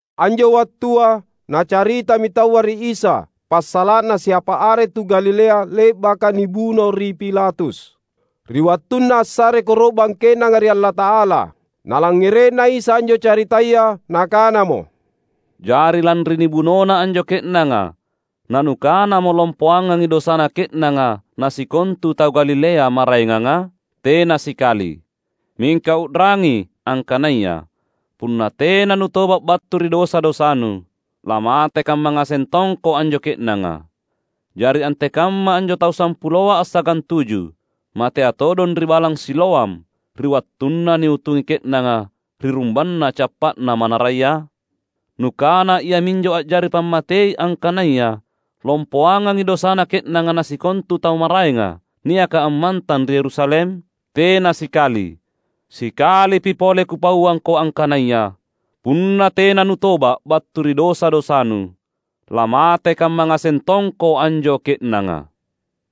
Anjo wattua nacaritami taua ri Isa passala’na siapa are tu Galilea le’baka nibuno ri Pilatus, ri wattunna assare koro’bang ke’nanga ri Allata’ala. Nalangngere’na Isa anjo caritaya Nakanamo, "Jari lanri nibunona anjo ke’nanga nanukanamo lompoangangi dosana ke’nanga na sikontu tu Galilea maraenganga? Tena sikali! Mingka u’rangi, angkanaya: punna tena nutoba’ battu ri dosa-dosanu, lamate kamma ngaseng tongko anjo ke’nanga. Jari antekamma anjo tau sampuloa assagantuju, matea todong ri balang Siloam ri wattunna niutungi ke’nanga ri rumbanna cappa’na manaraya? Nukana iaminjo a’jari pammatei angkanaya lompoangangi dosana ke’nanga na sikontu tau maraenga, niaka ammantang ri Yerusalem? Tena sikali! Sikalipi pole Kupauangko angkanaya: Punna tena nutoba’ battu ri dosa-dosanu, lamate kamma ngaseng tongko anjo ke’nanga."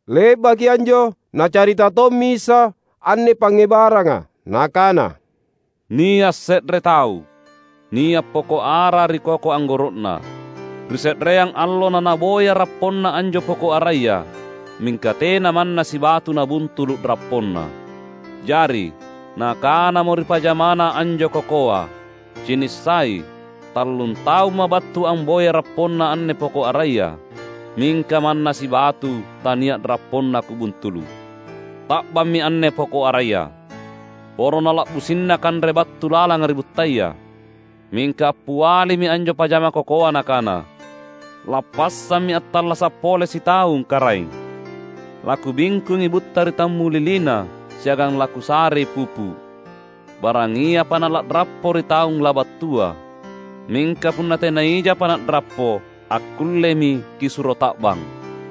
Le’baki anjo, Nacarita tommi Isa anne pangngebaranga, Nakana, "Nia’ se’re tau, nia’ poko’ ara ri koko anggoro’na. Ri se’reang allo nanaboya rapponna anjo poko’ araya, mingka tena manna sibatu nabuntulu’ rapponna. Jari, nakanamo ri pajamana anjo kokoa, ‘Cinissai, tallung taumma’ battu amboyai rapponna anne poko’ araya, mingka manna sibatu tania’ rapponna kubuntulu’. Ta’bammi anne poko’ araya! Poro nala’bussina kanre battu lalanga ri buttaya!’ Mingka appialimi anjo pajama kokoa nakana, ‘Lappassammi attallasa’ pole sitaung, karaeng. Lakubingkungi butta ri tammulilina siagang lakusarei pupu’. Barangiapa nala’rappo ri taung labattua. Mingka punna tena ijapa na’rappo, akkullemi kisuro ta’bang.’"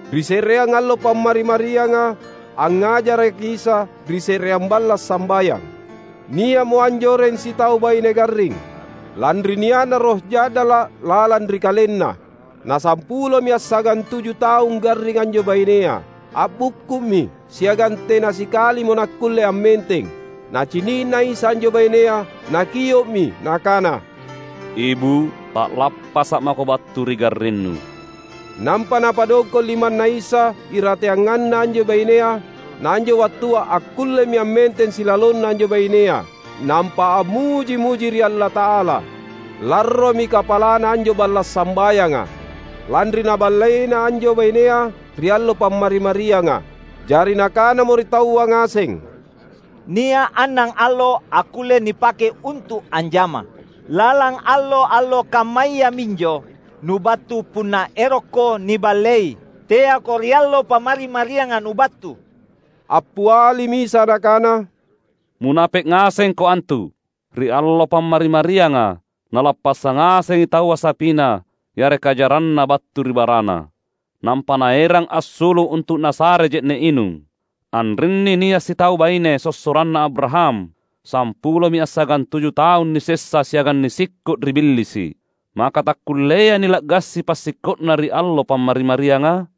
Ri se’reang allo Pammari-marianga, angngajaraki Isa ri se’reang balla’ sambayang. Nia’mo anjoreng sitau baine garring, lanri nia’na roh ja’dala’ lalang ri kalenna. Na sampulomi assagantuju taung garring anjo bainea. A’bukku’mi siagang tena sikalimo nakkulle ammenteng. Nacini’na Isa anjo bainea, Nakio’mi Nakana, "Ibu’, ta’lappasa’ mako battu ri garrinnu!" Nampa Napadongko’ limanNa Isa irateanganna anjo bainea; na anjo wattua akkullemi ammenteng silalonna anjo bainea, nampa ammuji-muji ri Allata’ala. Larromi kapalana anjo balla’ sambayanga, lanri Naballeina anjo bainea ri allo Pammari-marianga. Jari nakanamo ri taua ngaseng, "Nia’ annangallo akkulle nipake untu’ anjama; lalang allo-allo kammaya minjo nubattu punna erokko niballei, teako ri allo Pammari-marianga nubattu!" Appialimi Isa Nakana, "Munape’ ngasengko antu! Ri allo Pammari-marianga nalappassang ngasengi taua sapina yareka jaranna battu ri barana, nampa naerang assulu’ untu’ nasare je’ne’ inung. Anrinni nia’ sitau baine, sossoranna Abraham, sampulomi assagantuju taung nisessa siagang nisikko’ ri Billisi’. Maka takkulleai nila’gasi passikko’na ri Allo Pammari-marianga?"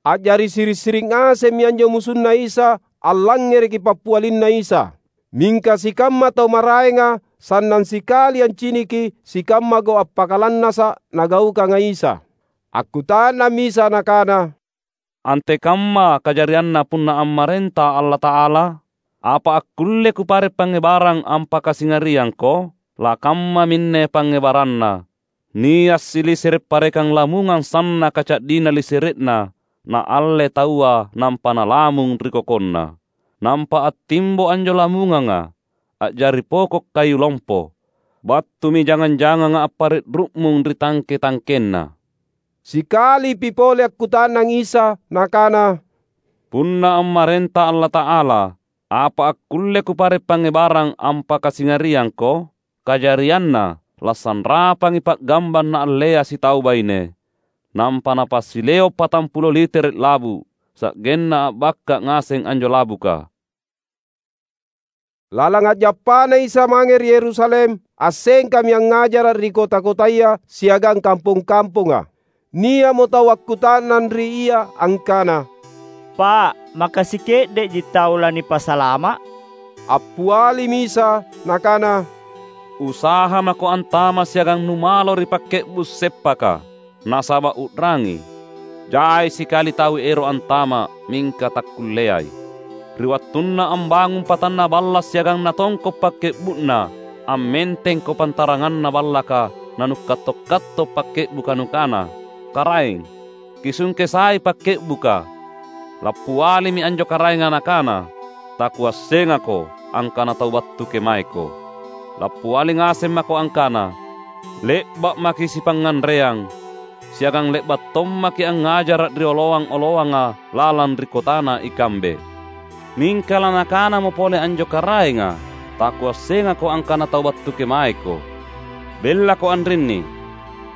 A’jari siri’-siri’ ngasemmi anjo musunNa Isa allangngereki pappialinNa Isa; mingka sikamma tau maraenga sannang sikali anciniki sikamma gau’ appakalannasa’ Nagaukanga Isa. Akkuta’nammi Isa Nakana, "Antekamma kajarianna punna ammarenta Allata’ala? Apa akkulle Kupare’ pangngebarang ampakasingariangko? Lakammaminne pangngebaranna: Nia’ silisere’ parekang lamungang sannaka ca’dina lisere’na naalle taua nampa nalamung ri kokonna. Nampa attimbo anjo lamunganga, a’jari poko’ kayu lompo. Battumi jangang-janganga appare’ ru’mung ri tangke-tangkenna." Sikalipi pole akkuta’nang Isa Nakana, "Punna ammarenta Allata’ala apa akkulle Kupare’ pangngebarang ampakasingariangko? Kajarianna lasanrapangi pa’gambang naallea sitau baine, nampa napasileo’ patampulo litere’ labu’, sa’genna a’bakka ngaseng anjo labuka." Lalang a’jappaNa Isa mange ri Yerusalem, assengkami angngajara’ ri kota-kotaya siagang kampong-kamponga. Nia’mo tau akkuta’nang ri Ia angkana, "Pa’, maka sike’de’ji tau lanipasalama’?" Appialimi Isa Nakana, "Usaha mako antama’ siagang numalo ri pakke’bu’ seppaka. Nasaba’ u’rangi! Jai sikali tau ero’ antama’ mingka takkulleai. Ri wattunna ambangung patanna balla’ siagang natongko’ pakke’bu’na, ammentengko pantaranganna ballaka nanukatto’-katto’ pakke’buka nukana, ‘Karaeng, kisungke sai pakke’buka!’ Lappialimi anjo karaenga nakana, ‘Takuassengako angkana tau battu kemaeko!’ Lappiali ngaseng mako angkana, ‘Le’ba’ maki’ sipangnganreang, siagang le’ba’ tommaki’ angngajara’ ri oloang-oloanga lalang ri kotana ikambe!’ Mingka lanakanamo pole anjo karaenga, ‘Takuassengako angkana tau battu kemaeko. Bellako anrinni,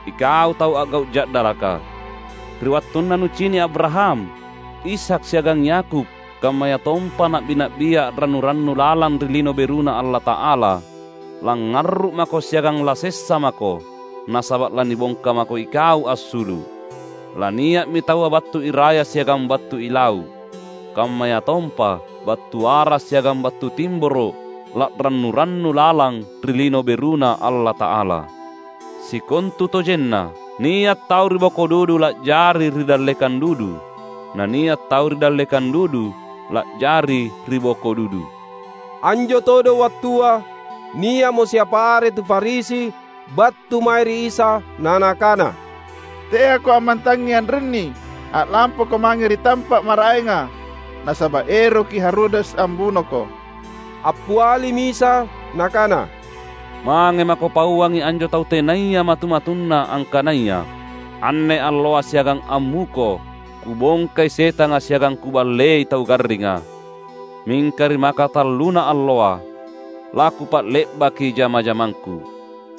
ikau tau a’gau’ ja’dalaka!’ Ri wattunna nucini’ Abraham, Ishak, siagang Yakub kammayatompa na’bi-na’bia a’rannu-rannu lalang ri Lino BeruNa Allata’ala, langngarru’ mako siagang lasessa mako, nasaba’ lanibongka mako ikau assulu’! Lania’mi taua battu iraya siagang battu ilau’, kammayatompa battu wara’ siagang battu timboro’ la’rannu-rannu lalang ri Lino BeruNa Allata’ala. Sikontutojenna, nia’ tau ri boko dudu la’jari ri dallekang dudu, na nia’ tau ri dallekang dudu la’jari ri boko dudu." Anjo todong wattua, nia’mo siapa are tu Farisi battu mae ri Isa na nakana, "TeaKo ammantangngi anrinni! A’lampaKo mange ri tampa’ maraenga, nasaba’ eroki Herodes ambunoKo." Appialimi Isa Nakana, "Mange mako pauangi anjo tau tenaya matu-matunna angkanaya, ‘Anne alloa siagang ammuko Kubongkai setanga siagang Kuballei tau garringa, mingka ri maka talluna alloa, laKupa’le’baki jama-jamangKu.’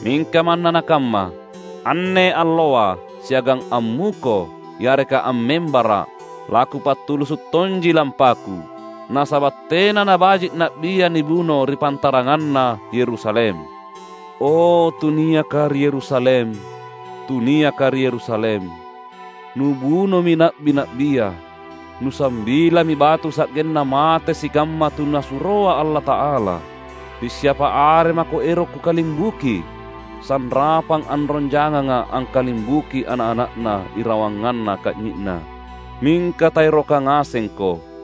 Mingka manna nakamma, anne alloa, siagang ammuko yareka ammembara’, laKupatulusu’ tonji lampaKu. Nasaba’ tena nabaji’ na’bia nibuno ri pantaranganna Yerusalem. O, tuniaka ri Yerusalem, tuniaka ri Yerusalem! Nubunomi na’bi-na’bia! Nusambilami batu sa’genna mate sikamma tu Nasuroa Allata’ala! Pissiapa are mako ero’ Kukalimbuki, sanrapang anrong janganga angkalimbuki ana’-ana’na irawanganna ka’nyi’na, mingka taeroka ngasengko!